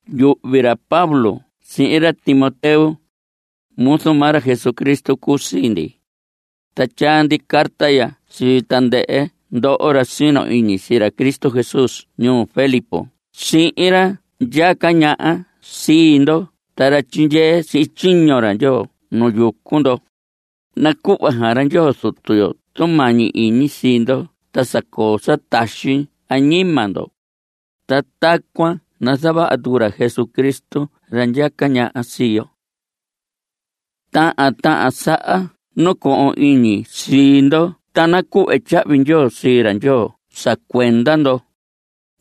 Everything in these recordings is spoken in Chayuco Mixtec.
Yuhvi ra Pablo sihin ra Timoteo, muzu maa ra Jesucristo cuu sii ndi. Ta tyaa ndi carta ya sii tandɨhɨ ndoho ra sino iñi sii ra Cristo Jesús ñuu Filipos sihin ra ndyaca ñaha sii ndo ta ra tyindyee sihin tyiño ra Ndyoo nu yucu ndo. Nacuhva xaan ra Ndyoo Zutu yo tumañi iñi sii ndo ta sa coo sa taxi añima ndo. Ta tacuan nazavaha tucu ra Jesucristo ra ndyaca ñaha sii yo. Tahan tahan saha nacohon iñi sii ndo ta nacuhve tyahvi ndyoo sii ra Ndyoo sa cuenda ndo.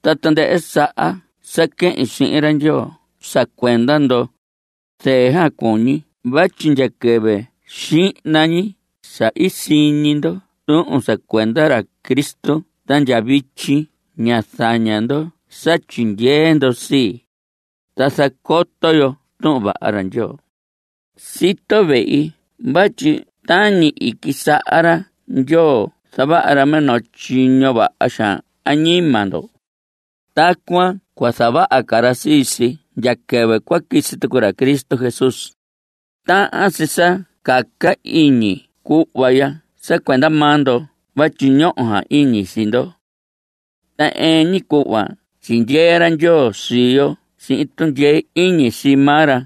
Ta tandɨhɨ saha sa quehin sihin ra Ndyoo sa cuenda ndo, zɨɨ xaan cuñi vatyi ndya quɨvɨ xihna ñi sa i siñi ndo tuhun sa cuenda ra Cristo ta ndya vityi ña zaña ndo sa tyindyee ndo sii, ta zacoto yo Tuhun Vaha ra Ndyoo. Sito vehi vatyi tañi i quisaha ra Ndyoo zavaha ra minoo tyiño vaha xaan añima ndo, tacuan cua zavaha ca ra sii si ndya quɨvɨ cua quisi tucu ra Cristo Jesús. Tahan si sa caca iñi cuhva ya sa cuenda maa ndo vatyi ñoho xaan iñi sii ndo. Ta ɨɨn ñi cuhva tyindyee ra Ndyoo sii yo sihin tundyee iñi sii maa ra.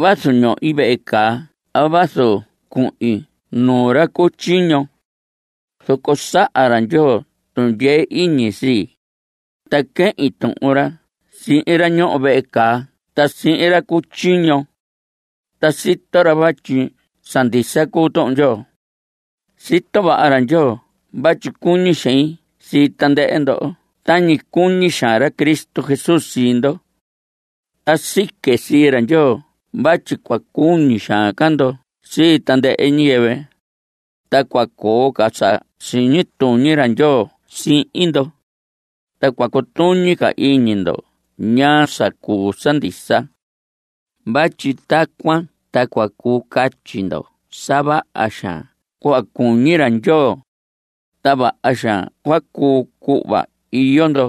Vazu ñohi vehe caa a vazu cuhin nuu ra cu tyiño, zoco saha ra Ndyoo tundyee iñi sii, ta quehin tuhun ra sihin ra ñoho vehe caa ta sihin ra cu tyiño. Ta sito ra vatyi sa ndisa cuu Tuhun Ndyoo. Sito vaha ra Ndyoo vatyi cuñi xein sii tandɨhɨ ndo tañi cuñi xaan ra Cristo Jesús sii ndo. Ta sique sii ra Ndyoo vatyi cua cuñi xaan ca ndo sii tandɨhɨ ñiyɨvɨ, ta cua coo ca sa siñi tuñi ra Ndyoo sihin ndo, ta cua cutuñi ca iñi ndo ñaa sa cuu sa ndisa. Vatyi tacuan ta cua cuu casi ndo sa vaha xaan cuhva cuñi ra Ndyoo, ta vaha xaan cua cuu cuhva iyo ndo,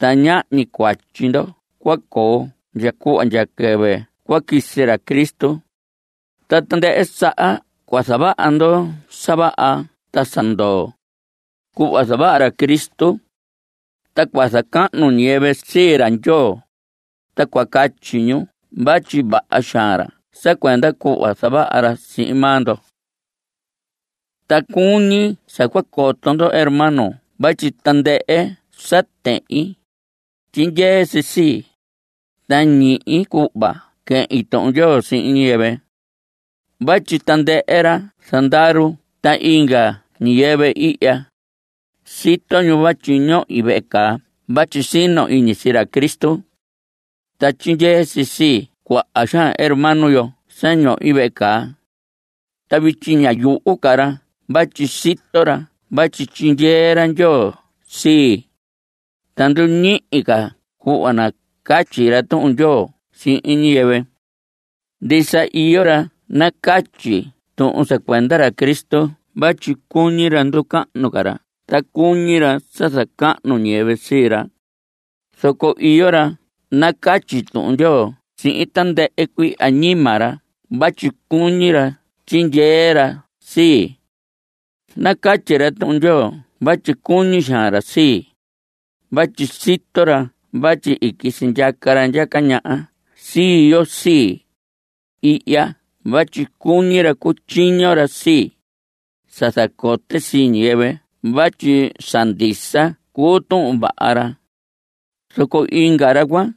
ta ñahñi cuatyi ndo cua coo ndya cuhva ndya quɨvɨ cua quisi ra Cristo. Ta tandɨhɨ saha cua zavaha ndo sa vaha ta sa ndoo, cuhva zavaha ra Cristo. Ta cua zacahnu ñiyɨvɨ sii ra Ndyoo, ta cua catyi ñu vatyi vaha xaan ra sa cuenda cuhva zavaha ra sihin maa ndo. Ta cuñi sa cua coto ndo hermanos vatyi tandɨhɨ sa tehin, tyindyee si sii, ta ñihi cuhva quehin Tuhun Ndyoo sihin ñiyɨvɨ. Vatyi tandɨhɨ ra zandaru ta inga ñiyɨvɨ ihya, sito ñu vatyi ñohi vehe caa vatyi sino iñi sii ra Cristo. Ta tyindyee si sii cuaha xaan hermano yo sa ñohi vehe caa. Ta vityi ña yuhu ca ra vatyi sito ra vatyi tyindyee ra Ndyoo sii, ta nduñihi ca cuhva nacatyi ra Tuhun Ndyoo sihin ñiyɨvɨ. Ndisa iyo ra nacatyi tuhun sa cuenda ra Cristo vatyi cuñi ra nducahnu ca ra ta cuñi ra sa zacahnu ñiyɨvɨ sii ra. Zoco iyo ra nacatyi Tuhun Ndyoo sihin tandɨhɨ cuii añima ra vatyi cuñi ra tyindyee ra sii. Nacatyi ra Tuhun Ndyoo vatyi cuñi xaan ra sii, vatyi sito ra vatyi i quisi ndyaca ra ndyaca ñaha sii yo sii, ihya vatyi cuñi ra cutyiño ra sii, sa zacote sii ñiyɨvɨ vatyi sa ndisa cuu Tuhun Vaha ra. Zoco inga ra cuan,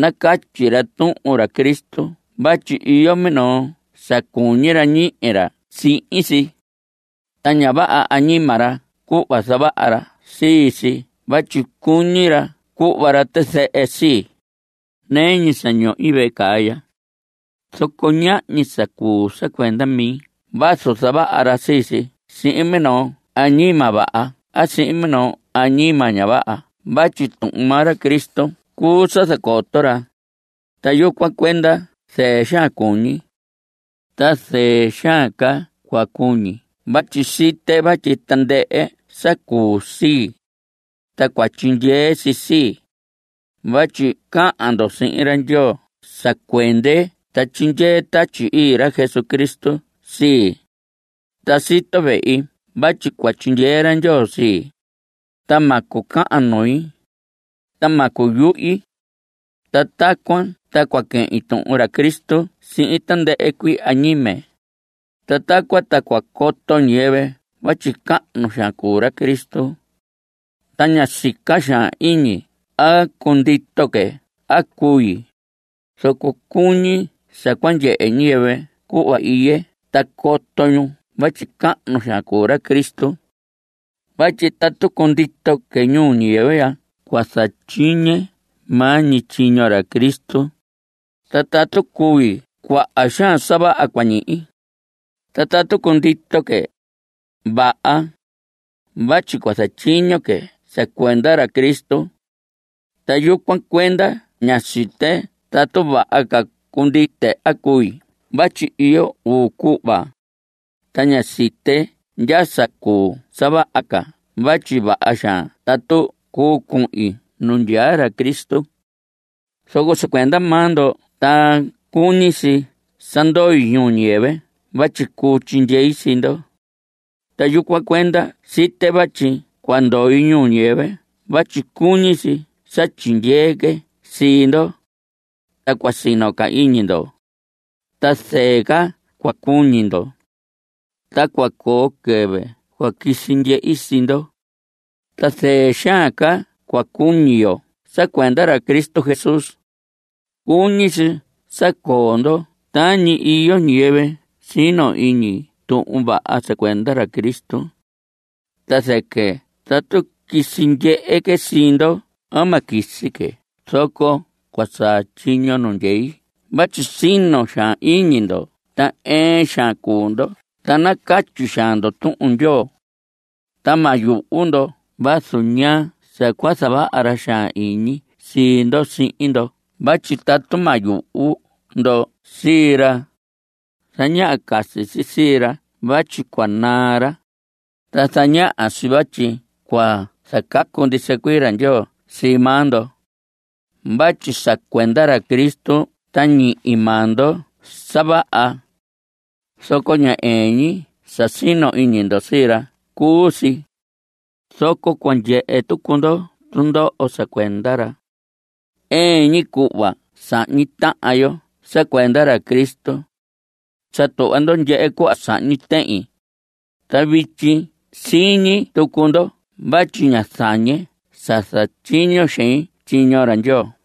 nacatyi ra tuhun ra Cristo vatyi iyo minoo sa cuñi ra ñihi ra sihin si. Ta ña vaha añima ra cuhva zavaha ra sii si vatyi cuñi ra cuhva ra tizɨhɨ sii, nɨɨ ñi sa ñohi vehe caa ya. Zoco ñahñi sa cuu sa cuenda mi vazu zavaha ra sii si sihin minoo añima vaha a sihin minoo añima ña vaha vatyi tuhun maa ra Cristo cuu sa zacoto ra, ta yucuan cuenda zɨɨ xaan cuñi. Ta zɨɨ xaan ca cua cuñi vatyi site vatyi tandɨhɨ sa cuu sii, ta cua tyindyee si sii, vatyi cahan ndo sihin ra Ndyoo sa cuende ta tyindyee Tatyi Ii ra Jesucristo sii. Ta sito vehi vatyi cua tyindyee ra Ndyoo sii, ta ma cucahan nui, ta ma cuyuhi. Ta tacuan ta cua quehin tuhun ra Cristo sihin tandɨhɨ cuii añime. Ta tacuan ta cua coto ñiyɨvɨ vatyi cahnu xaan cuu ra Cristo. Ta ña sica xaan iñi a cundito que a cui, zoco cuñi sa cua ndyehe ñiyɨvɨ cuhva iye ta coto ñu vatyi cahnu xaan cuu ra Cristo. Vatyi tatu cundito que ñuu ñiyɨvɨ ya cua zatyiñe maa ñi tyiño ra Cristo, ta tatu cui cuaha xaan sa vaha cua ñihi. Ta tatu cundito que, vaha, vatyi cua zatyiño que sa cuenda ra Cristo. Ta yucuan cuenda ña site tatu vaha ca cundite a cui vatyi iyo uu cuhva, ta ña site ndya sa cuu sa vaha ca vatyi vaha xaan tatu cuu cuhin nu ndyaa ra Cristo. Zoco sa cuenda maa ndo ta cuñi si sa ndoi ñuu ñiyɨvɨ vatyi cuu tyindyei sii ndo. Ta yucuan cuenda site vatyi cua ndoi ñuu ñiyɨvɨ vatyi cuñi si sa tyindyee que sii ndo, ta cua sino ca iñi ndo, ta zɨɨ ca cua cuñi ndo. Ta cua coo quɨvɨ cua quisi ndyehi sii ndo, ta zɨɨ xaan ca cua cuñi yo sa cuenda ra Cristo Jesús. Cuñi si sa coo ndo tañi iyo ñiyɨvɨ sino iñi Tuhun Vaha sa cuenda ra Cristo. Ta zɨquɨ tatu quisi ndyehe que sii ndo a ma quisi que zoco cua saa tyiño nu ndyei vatyi sino xaan iñi ndo ta ɨɨn xaan cuu ndo ta nacatyi xaan ndo Tuhun Ndyoo. Ta ma yuhu ndo vazu ñaa sa cua zavaha ra xaan iñi sii ndo sihin ndo vatyi tatu ma yuhu ndo sii ra, zañaha casi si sii ra vatyi cua naa ra, ta zañaha si vatyi cua zacacu ndisa cuii ra Ndyoo sii maa ndo. Vatyi sa cuenda ra Cristo ta ñihi maa ndo sa vaha, zoco ña ɨɨn ñi sa sino iñi ndo sii ra cuu si, zoco cua ndyehe tucu ndo tundoho sa cuenda ra. Ɨɨn ñi cuhva sahñi tahan yo sa cuenda ra Cristo. Sa tuhva ndo ndyehe cuhva sahñi tehin, ta vityi siñi tucu ndo vatyi ña zañe sa zatyiño xein tyiño ra Ndyoo.